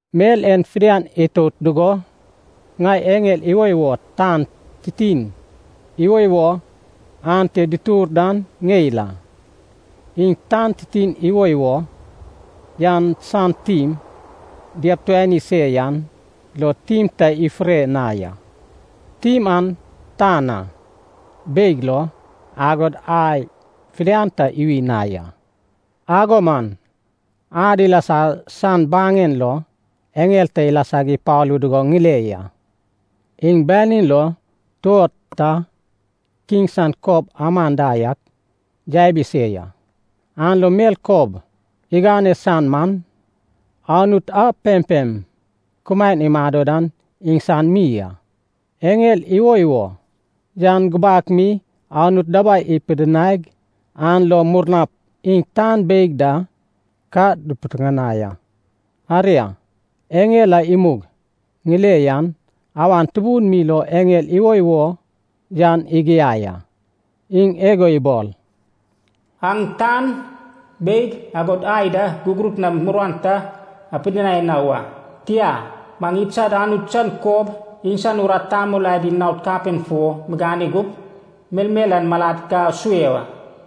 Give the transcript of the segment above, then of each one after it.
Mel en fidian itout dugo, ŋai eŋel iwoiwo tan titin iwoiwo ante dutur dan ŋeil a. Iŋ tan titin iwoiwo yan san tim diabituani se yan lo tim ta ifure na ya. Tim an tan na, beig lo, agod ai fidian ta iwi na ya. Ago man ad ilasa san baŋen lo eŋel ta ilasag ipalu dugo ŋile ya. Iŋ banin lo tuod ta kiŋ san kob aman da yak yabi se ya, an lo mel kob igane san man, Anut a pempem kumaen imado dan iŋsan mi a. Eŋel iwoiwo yan gubak mi Anut dabai ipidinaig, an lo murnap iŋ tan beig da ka dupitiŋinai a. Aria, eŋel a imug ŋile yan awan tubun mi lo eŋel iwoiwo yan igiai a. Iŋ igo ibol, “Aŋ tan, beig, agod ai da, gugurut nam muruan ta apidinai na wa. Tia, maŋ idsad Anut san kob, iŋsan urat tamol adi naod kapen fo migane gup, melmel an malad ka asue wa.”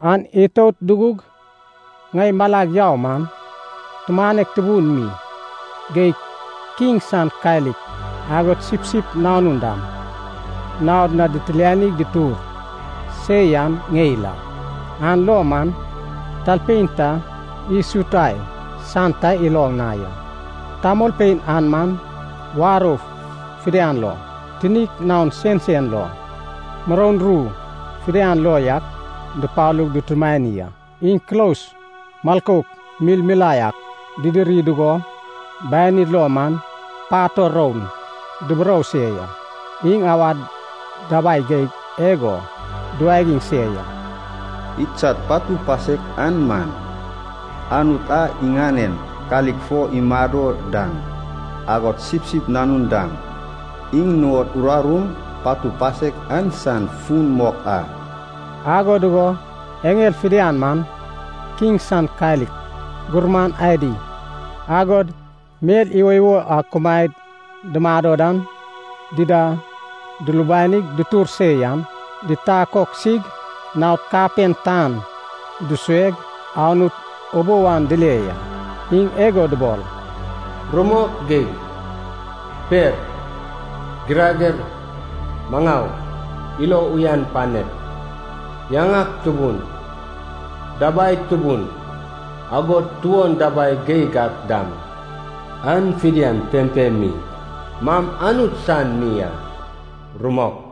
An itout dugug ŋai malag yau man, tumanek tubun mi geig kiŋ san kalik, agod Sipsip Nanun dam, naod na ditilianig dutur se yan ŋeil a. An lo man talpein ta isutai san ta iloŋ na ya. Tamolpein an man warou fidian lo, tinik naon sensen lo, muroun ru fidian lo yak dupalug dutumani a. Iŋ kulos milkouk milmilae ak didiri dugo, banid lo man pator roun duburou se ya. Iŋ awad dabai geig igo duwagiŋ se ya, “Idsad patu pasek an man, Anut a iŋanen kalik fo imado dan, agod Sipsip Nanun dam, iŋ nuŋod urarum patu pasek an san fun mok a.” Ago dugo eŋel fidian man, kiŋ san kalik, gurman adi, agod mel iwoiwo a kumaed dumado dan dida dulubanaig dutur se yan, ditakoksig naod kapen tan dusueg Anut ubou an dile ya. Iŋ igo dubol, “Rumok geig, per, girager, maŋau, ilo uyan panek, yaŋak tubun, dabai tubun, agod tuon dabai geig ak dam, an fidian pempem mi man Anut san mi a. Rumok!”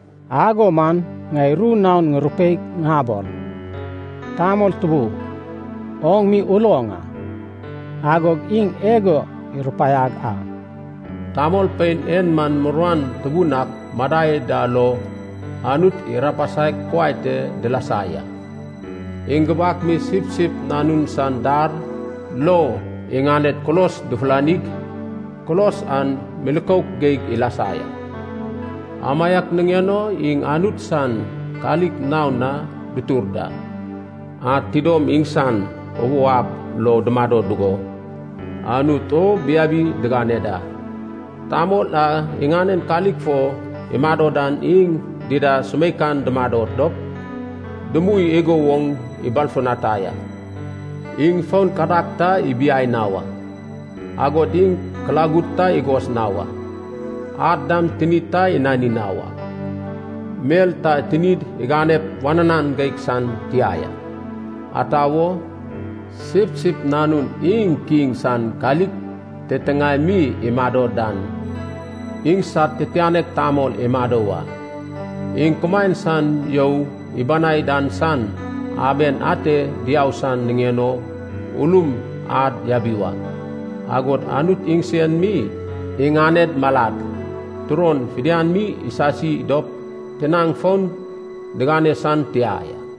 Ago man ŋai ru naon ŋurupeig ŋabol, “Tamol tubu, oŋ mi uloŋ a.” Agog iŋ igo irupaiag a, “Tamolpein en man muruan tubun ak madai da lo, Anut irapasaig kuai te dilasa ya. Iŋ gubak mi Sipsip Nanun san dar lo iŋaned kulos dufulanig, kulos an milkouk geig ilasa ya. Amaiak niŋen o, “Iŋ Anut san kalik naon na dutur da. Ad tidom iŋsan ubou ab lo dumado dugo, Anut o biabi digane da. Tamol a iŋanen kalik fo imado dan, iŋ dida sumeikan dumado dop dumui igo woŋ ibalfutanai a. Iŋ fon kadag ta ibiai na wa, agod iŋ kulagud ta igos na wa. Ad dam tinid ta inani na wak, mel ta tinid iganep wananan geig san tia ya. Ata wo, Sipsip Nanun iŋ kiŋ san kalik titiŋae mi imado dan, iŋsad titianek tamol imado wa. Iŋ kumaen san you ibanai dan san aben ate diau san niŋen o ulum ad yabi wa. Agod Anut iŋsen mi iŋaned malad turon fidian mi isasi dop tinaŋ fon digane san tia ya.”